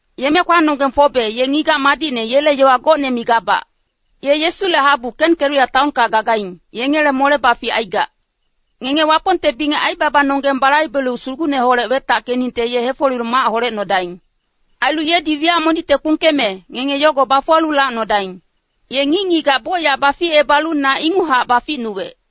Yeme-kwanonggeng Fobe, ye ngigac madicne yele yowa gocne migabac. Ye Yesule habu Kenkeria taonka gagaing, yengele mole-bafic aigac. Ngenge Wapongte bingec aibabanonggeng balaibelu Sugucneholec wetackeningte ye hefolelu mac holecnodaing. Ailu yedi wiyac monicte kpungkeme, ngenge yogo bafuwalu lacnodaing. Ye ngic-ngigac bocyac baficebalu na inguchac baficnuwec.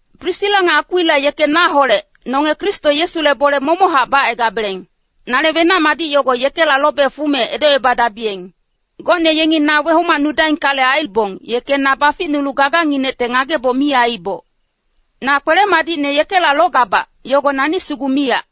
Prisila nga Akwila yeke naholec nonge Kristo Yesule bole momochac bacaigabeleng. Nale wenac-madic yogo yekela lobe fume edocepadabiyeng. Gocne yengi na wehomacnudaingkale aibong, yeke na baficnulu gaganginecte ngageboc mi aiiboc. Na kwele-madicne yekela logabac, yogo nani sugu miyac.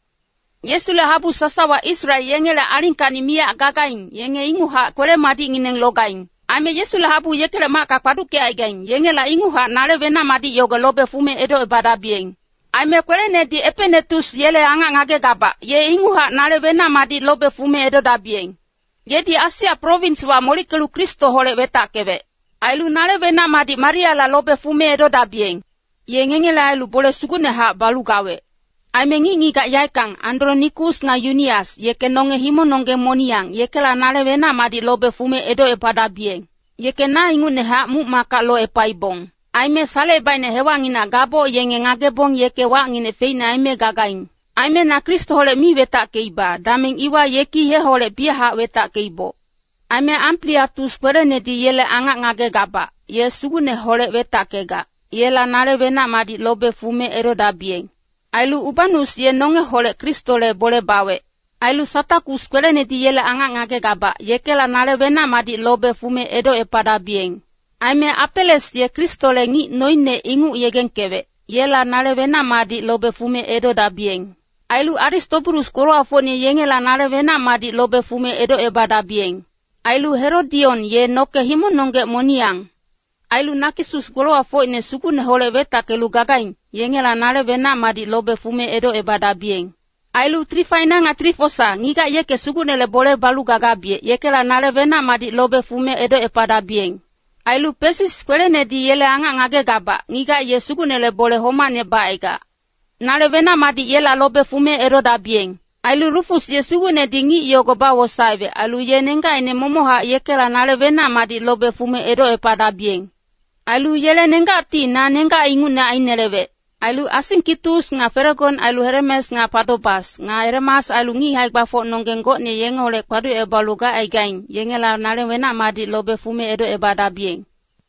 Yesule habu sasawa Israel yengele alingkacni miyac gagaing, yenge inguchac kwele-madicngineng logaing. Aime Yesule habu yekele macka kpaduckecaigaing, yengela inguchac nale wenac-madic yogo lobe fume edocebadabiyeng. Aime kwelenedi Epenetus yele angac ngagegabac, ye inguchac nale wenac-madic lobe fume edodabiyeng. Yedi Asia prowinswa molickelu Kristoholec wetackewec. Ailu nale wenac-madic Mariala lobe fume edodabiyeng. Ye ngengele ailu bole sugucnehac balu gawec. Aime ngic-ngigac yaeckang, Andronikus nga Yunias, yeke nonge himongnonggeng moniyang, yekela nale wenac-madic lobe fume edocepadabiyeng. Yeke na ingucnehac muc-macka locepaibong. Aime salecebaicne hewacnginang gaboc yenge ngagebong yeke wacnginec feicne aime gagaing. Aime na Kristoholec mi wetackeiba, dameng iwa yeki yeholec biyachac wetackeiboc. Aime Ampliatus kwelenedi yele angac ngagegabac, ye Sugucneholec wetackegac, yela nale wenac-madic lobe fume edodabiyeng. Ailu Ubanus ye nongeholec Kristole bole bawec. Ailu Satakus kwelenedi yele angac ngagegabac, yekela nale wenac-madic lobe fume edocepadabiyeng. Aime Apeles ye Kristole ngic noine inguc yegengkewec, yela nale wenac-madic lobe fume edodabiyeng. Ailu Aristobulus golowacfocine yengela nale wenac-madic lobe fume edocebadabiyeng. Ailu Herodion ye noke himongnonggec moniyang. Ailu Nakisus golowacfocine Sugucneholec wetackelu gagaing, yengela nale wenac-madic lobe fume edocebadabiyeng. Ailu Trifaena nga Trifosa, ngigac yeke Sugucnele bole balu gagabiyec, yekela nale wenac-madic lobe fume edocepadabiyeng. Ailu Pesis kwelenedi yele angac ngagegabac, ngigac ye Sugucnele bole homacne bacaigac. Nale wenac-madic yela lobe fume edodabiyeng. Ailu Rufus ye Sugucnedi ngic yogo bawosaewec, ailu ye nenggacine momochac, yekela nale wenac-madic lobe fume edocepadabiyeng. Ailu yele nenggacti na nenggac ingucne ainelewec. Ailu Asingkitus nga Felegon ailu Heremes nga Patobas, nga Heremas ailu ngic hae-gbafocnonggeng gocne yengeholec kpaducebalu gacaigaing, yengela nale wenac-madic lobe fume edocebadabiyeng.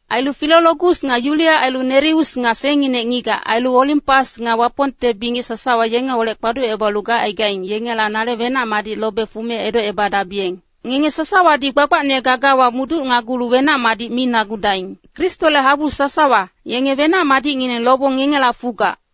Ailu Filologus nga Yulia ailu Nereus nga sengngine ngigac, ailu Olimpas nga Wapongte bingec sasawa yengeholec kpaducebalu gacaigaing, yengela nale wenac-madic lobe fume edocebadabiyeng. Ngenge sasawadi gbagbacne gagawa muducnagulu wenac-madic minagudaing. Kristole habu sasawa, yenge wenac-madicngineng lobong ngengela fugac.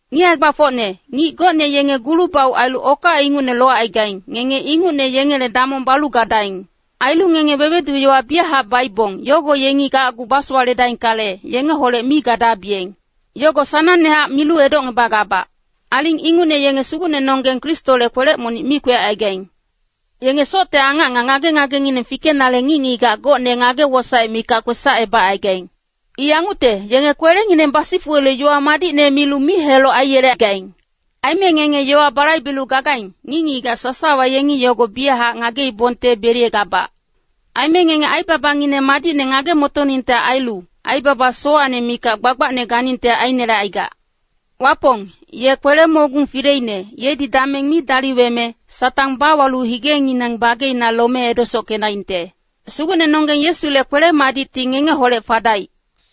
Ngic hae-gbafocne, ngic gocne yenge gulu-bauc ailu okac ingucne locaigaing, ngenge ingucne yengele damong balu gadaing. Ailu ngenge wewedu-yowa biyachac baibong, yogo yengi gacgu basowaledaingkale, yengeholec mi gadabiyeng. Yogo sanangnehac milu edocngebagabac. Aling ingucne yenge Sugucnenonggeng Kristole kwelec monic mi kwecaigaing. Yenge socte angac nga ngage-angacngineng fikenale ngic-ngigac gocne ngage-wosaec mikac kwesacebagaing. I yangucte, yenge kwelengineng basifuwelu yowa madicne milu mic-heloc aiyelegaing. Aime ngenge yowa balaibelu gagaing, ngic-ngigac sasawa yengi yogo biyachac ngagengeleibongte beliyegabac. Aime ngenge aibabangineng madicne ngage-motoningte ailu, aibaba sowacne mikac gbagbacne ganingte ainelecaigac. Wapong, ye kwele-mogung fileine, yedi dameng mi daliweme, Satang bawalu higengineng bageina lome edesockedaingte. Sugucnenonggeng Yesule kwele-madicti ngengeholec fadaic.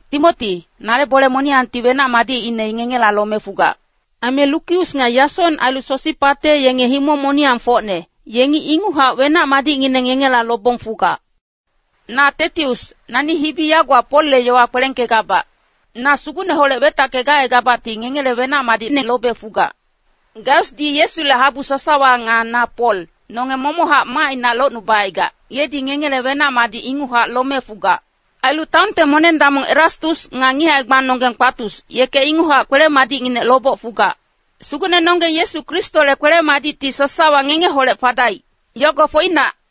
Timoti, nale bole moniyangti wenac-madicine ngengela lome fugac. Aime Lukius nga Yasong ailu Sosipate yenge himong moniyangfocne, yengi inguchac wenac-madicngineng ngengela lobong fugac. Na Tetius, nani hibi yagowa Polle yowa kwelengkegabac. Na Sugucneholec wetacke gacaigabacti ngengela wenac-madicne lobe fugac. Gaiusdi Yesule habu sasawa nga na Pol, nonge momochac macina locnubacaigac, yedi ngengele wenac-madic inguchac lome fugac. Ailu taonte moneng-damong Erastus, nga ngic hae-gbanonggeng Kwatus, yeke inguchac kwele-madicnginec loboc fugac. [Sugucnenonggeng Yesu Kristole kwele-madicti sasawa ngengeholec fadaic. Yogo foinac.]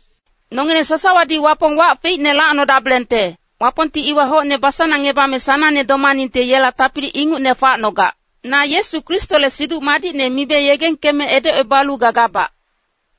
Nongileng sasawadi Wapong wac feicne lacnodabelengte. Wapongti iwa hocne basanangngebame sanangne domaningte yela tapili ingucne facnogac. Na Yesu Kristole Siduc Madicne mibe yegengkeme edocebalu gagabac.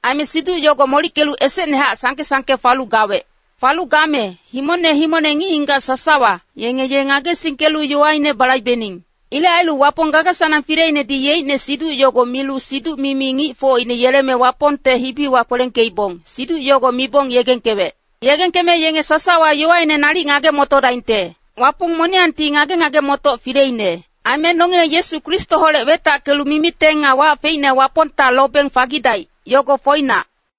Aime Siduc yogo molickelu esecnehac sangke-sangke falu gawec. Falu game, himongne himongne ngic-ngigac sasawa, yenge ye ngagesingkelu yowaine balaibening. Ilec ailu Wapong gaga-sanang fileinedi yeicne Siduc yogo milu siduc-mimi ngicfocine yeleme Wapongte hibiwa kwelengkeibong, Siduc yogo mibong yegengkewec. Yegengkeme yenge sasawa yowaine nalic ngage-motodaingte. Wapong moniyangti ngage-ngage-motoc fileine. Aime nongileng Yesu Kristoholec wetackelu mimiteng nga wac feicne Wapongta lobeng fagidaic, yogo foinac.